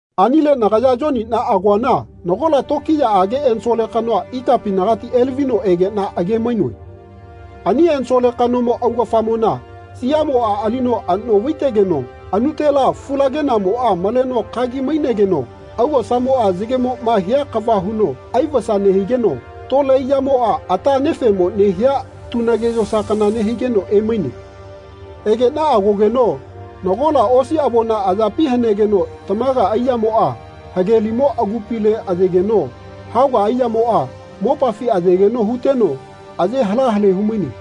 Anile nagaya Yoniꞌna agoana nagola tokiyaꞌage ensole kanoa ikapinagati elavino egeꞌna age-mainoe. Ani ensole kanomo augafamona siaꞌmoꞌa alino anoꞌvai-tegeno anutela fulagenaꞌmoꞌa maleno kagi-mainegeno augosamoꞌa yagemoꞌma hia kava huno aivasa nehigeno tole aiyamoꞌa ata anefeꞌmo nehia tunage yosa kana nehigeno emaine. Egeꞌna agogeno nagola osi avona ayapi hanegeno tamaga aiyamoꞌa hagelimo agupile ayegeno haoga aiyamoꞌa mopafi ayegeno huteno aye hala hale humaine.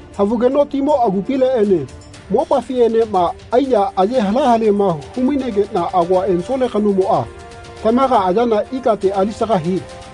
Havugeno timo agupileꞌene mopafiꞌenema aiya aye hala halema hu-mainegeꞌna agoa ensole kanomoꞌa tamaga ayana ikate alisaga hie.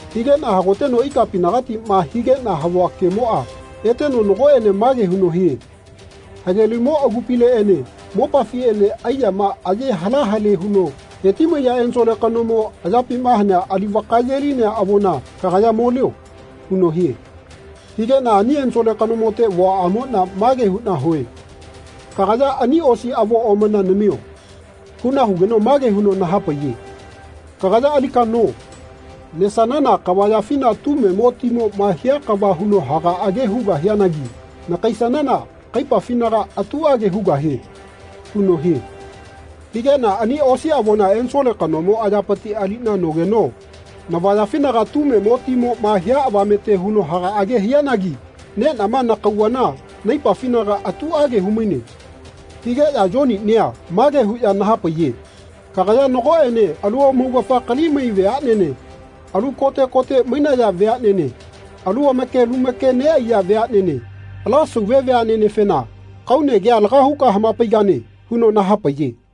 Higeꞌna hagoteno ikapinagatiꞌma higeꞌna havua kemoꞌa eteno nagoꞌene mage huno hie “Hagelimo agupileꞌene mopafiꞌene aiyama aye hala hale huno heti-maiya ensole kanomo ayapima hanea ali vakaye-linea avona kagaya molio.” huno hie. Higeꞌna ani ensole kanomote vuaꞌamoꞌna mage huꞌna hue “Kagaya ani osi avo omana namio.” huꞌna hugeno mage huno nahapaiye “Kagaya alika no. Nesanana kavayafina tumemo timoꞌma hia kava huno hagaꞌage hugahianagi nakaisanana kaipafinaga atuꞌage hugahie.” huno hie. Higeꞌna ani osi avona ensole kanomo ayapiti aliꞌna nogeno navayafinaga tumemo timoꞌma hia avamete huno hagaꞌage hianagi neꞌnama nakauvana naipafinaga atuꞌage humaine. Higeꞌya Yoninia mage huꞌya nahapaiye “Kagaya nagoꞌene alu amaugafa kalimai veaꞌnene, alu kote kote mainaya veaꞌnene, alu make lu make neꞌaiya veaꞌnene ala sauve veaꞌnenefena kaune kea laga huka hamapaigane.” huno nahapaiye.